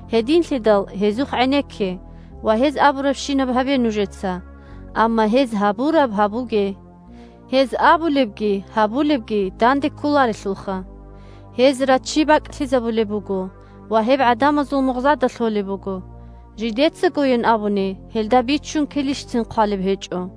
Гьединлъидал гьезухъ гӀенекке ва гьез абурабщинаб гьабе нужеца. Амма гьез гьабураб гьабуге. Гьез абулебги гьабулебги данде кколарелъулха. Гьез раччи бакӀлъизабулеб буго ва гьеб гӀадамазул мугъзада лъолеб буго. Жидецагойин абуни гьелда биччун килищцин хъвалеб гьечӀо.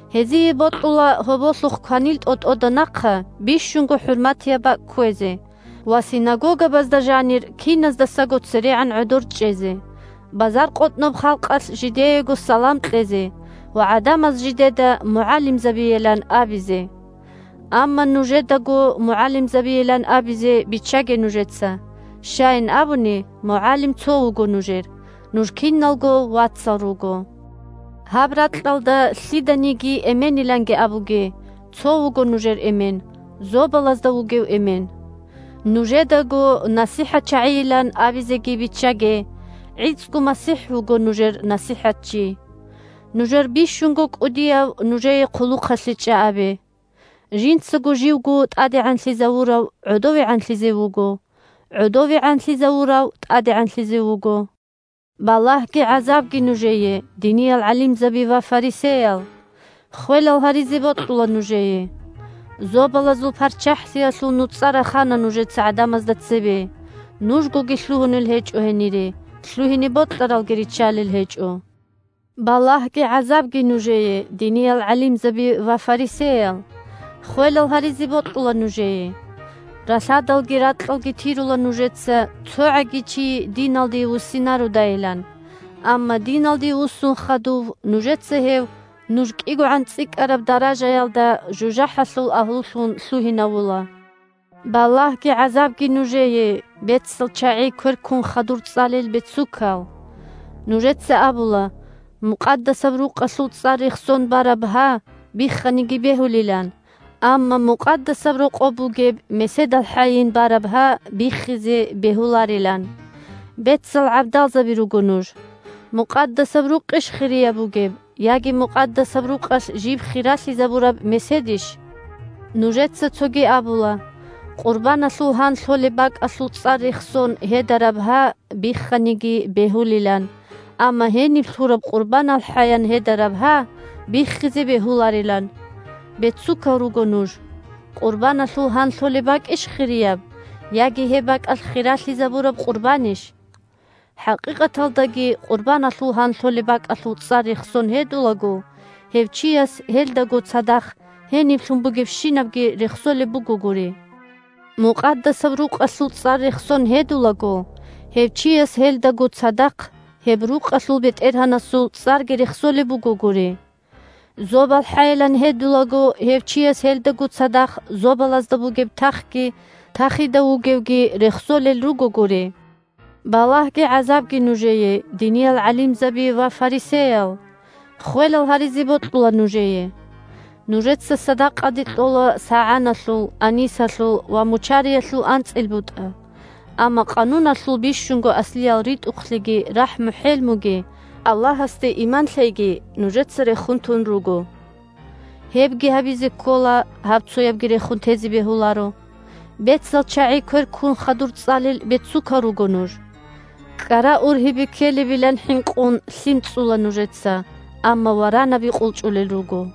Гьезие бокьула гьоболлъухъ кванил тӀотӀода нахъа бищунго хӀурматияб бакӀ кквезе ва синагогабазда жанир киназдасаго церегӀан гӀодор чӀезе, базаркъотӀноб халкъалъ жидеего салам кьезе ва гӀадамаз жидеда мугӀалимзабийилан абизе. Амма нужедаго мугӀалимзабийилан абизе биччаге нужеца. Щайин абуни, МугӀалим цо вуго нужер, нуж киналго вацал руго. Гьаб ракьалда лъиданиги эмениланги абуге, цо вуго нужер Эмен – зобалазда вугев Эмен. Нужедаго насихӀатчагӀийилан абизеги биччаге, гӀицӀго МасихӀ вуго нужер НасихӀатчи. Нужер бищунго кӀудияв нужее хъулухъалъе чӀа абе. Жинцаго живго тӀадегӀанлъизавурав гӀодовегӀанлъизе вуго, гӀодовегӀанлъизавурав тӀадегӀанлъизе вуго. Балагьги гӀазабги нужее, диниял гӀалимзаби ва фарисеял! Ххвелал гьаризе бокьула нужее! Зобалазул ПарччахӀлъиялъул нуцӀа рахана нужеца гӀадамазда цебе: нужгоги лъугьунел гьечӀо гьенире, лъугьине бокьаралги риччалел гьечӀо. Балагьги гӀазабги нужее, диниял гӀалимзаби ва фарисеял! Ххвелал гьаризе бокьула нужее! Ралъадалги ракьалги тирула нужеца, цогӀаги чи диналде вуссинародайилан. Амма диналде вуссун хадув, нужеца гьев, нуж кӀигогӀан цӀикӀкӀараб даражаялда, жужахӀалъул агьлулъун лъугьинавула. Балагьги гӀазабги нужее, бецал чагӀи квер ккун хадур цӀалел бецукал! Нужеца абула: «Мукъадасаб Рукъалъул цӀар рехсон бараб гьа бихханиги бегьулилан, амма Мукъадасаб Рокъоб бугеб меседалхӀайин бараб гьа биххизе бегьуларилан». Бецал гӀабдалзаби руго нуж. Мукъадасаб Рукъищ хирияб бугеб, яги Мукъадасаб Рукъалъ жиб хиралъизабураб меседищ? Нужеца цоги абула: «Къурбаналъул гьан лъолеб бакӀалъул цӀар рехсон гьедараб гьа бихханиги бегьулилан, амма гьениб лъураб къурбаналхӀаян гьедараб гьа биххизе бегьуларилан». Бецукал руго нуж! Къурбаналъул гьан лъолеб бакӀищ хирияб, яги гьеб бакӀалъ хиралъизабураб къурбанищ? ХӀакъикъаталдаги къурбаналъул гьан лъолеб бакӀалъул цӀар рехсон гьедулаго, гьев чияс гьелдаго цадахъ гьениб лъун бугебщинабги рехсолеб бугогури. Мукъадасаб Рукъалъул цӀар рехсон гьедулаго, гьев чияс гьелдаго цадахъ гьеб рукъалъул БетӀергьанасул цӀарги рехсолеб бугогури. ЗобалхӀайилан гьедулаго, гьев чияс гьелдаго цадахъ зобалазда бугеб тахги тахида вугевги рехсолел ругогури. Балагьги гӀазабги нужее, диниял гӀалимзаби ва фарисеял! Ххвелал гьаризе бокьула нужее! Нужеца садакъаде кьола сагӀаналъул, анисалъул ва мучариялъул анцӀил бутӀа Гьаниб бицунеб буго закагӀат бахъиялъул., амма Къануналъул бищунго аслиял ритӀухълъиги, рахӀму-хӀелмуги, Аллагьасде иман лъейги нужеца рехун тун руго. Гьебги гьабизе ккола, гьабцоябги рехун тезе бегьуларо. Бецал чагӀи квер ккун хадур цӀалел бецукал руго нуж! КӀкӀара ургьибе ккелебилан хӀинкъун, лъим цӀцӀула нужеца, амма варанаби къулчӀулел руго.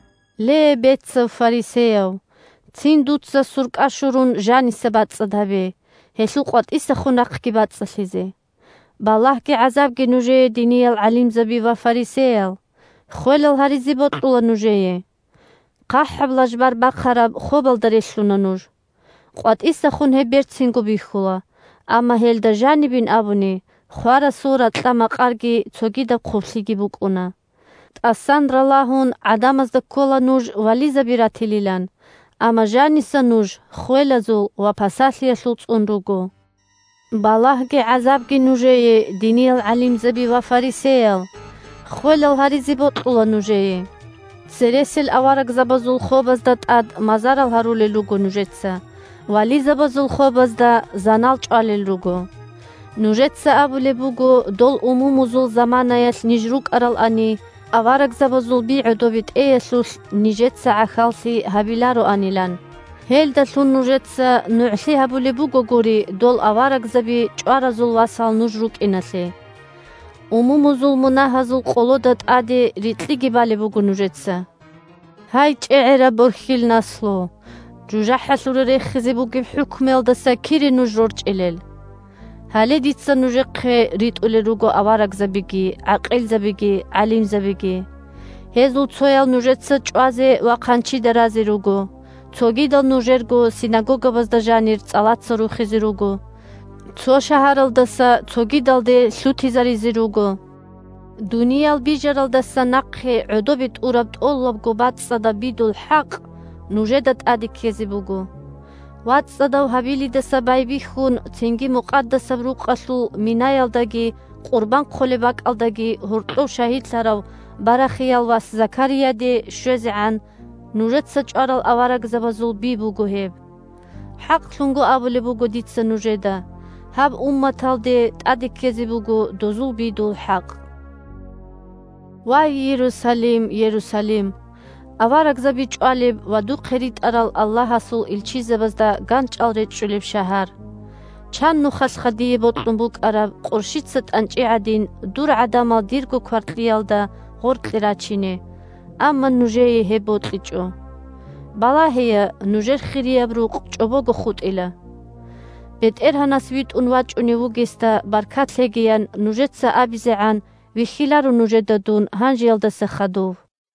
Ле бецав фарисеяв, цин дуца суркӀа-щурун жаниса бацӀцӀад гьабе, гьелъул къватӀисахун рахъги бацӀцӀалъизе. Балагьги-гӀазабги нужее, диниял гӀалимзаби ва фарисеял! Ххвелал гьаризе бокьула нужее! ХъахӀаб лажбар бахараб хобалда релълъуна нуж. КъватӀисахун гьеб берцинго бихьула, амма гьелда жанибин абуни, хварасул ракьа-макъарги цогидаб хъублъиги букӀуна. ТӀасан ралагьун, гӀадамазда ккола нуж вализаби ратилилан, амма жаниса нуж ххвелазул ва пасалъиялъул цӀун руго. Балагьги гӀазабги нужее, диниял гӀалимзаби ва фарисеял! Ххвелал гьаризе бокьула нужее! Цересел аварагзабазул хобазда тӀад мазарал гьарулел руго нужеца, вализабазул хобазда занал чӀвалел руго. Нужеца абулеб буго, дол умумузул заманаялъ ниж рукӀаралани, аварагзабазул би гӀодобе тӀеялъулъ нижеца гӀахьаллъи гьабилароанилан. Гьелдалъун нужеца нугӀлъи гьабулеб бугогури дол аварагзаби чӀваразул васал нуж рукӀиналъе. Умумузул мунагьазул къолода тӀаде рикьиги балеб буго нужеца. Гьай, чӀегӀераб борхьил наслу! ЖужахӀалъуре рехизе бугеб хӀукмуялдаса кире нуж рорчӀилел?! Гьале дица нужехъе ритӀулел руго аварагзабиги, гӀакъилзабиги, гӀалимзабиги. Гьезул цоял нужеца чӀвазе ва хъанчида разе руго. Цогидал нужерго синагогабазда жанир цӀалаца рухизе руго, цо шагьаралдаса цогидалде лъутизаризе руго. Дуниял бижаралдаса нахъе гӀодобе тӀураб тӀолабго бацӀцӀадаб бидул хӀакъ нужеда тӀаде ккезе буго. ВацӀцӀадав Гьабилидаса байбихьун, цинги Мукъадасаб Рукъалъул минаялдаги къурбан хъолеб бакӀалдаги гьоркьов шагьидлъарав Барахиял вас Закарияде щвезегӀан нужеца чӀварал аварагзабазул би буго гьеб. ХӀакълъун абулеб буго дица нужеда: гьаб умматалде тӀаде ккезе буго дозул бидул хӀакъ. Вай Иерусалим, Иерусалим! Аварагзаби чӀвалеб ва духъе ритӀарал Аллагьасул илчизабазда ганчӀал речӀчӀулеб шагьар! Чан нухалъха дие бокьун букӀараб, къурщица тӀанчӀи гӀадин, дур гӀадамал дирго кваркьиялда гъоркье рачине, амма нужее гьеб бокьичӀо. Балагьея, нужер Хирияб Рукъ чӀобого хутӀила. «БетӀергьанас витӀун вачӀунев вугесда баркат лъеги», – ян нужеца абизегӀан вихьиларо нужеда дун гьанжеялдаса хадув.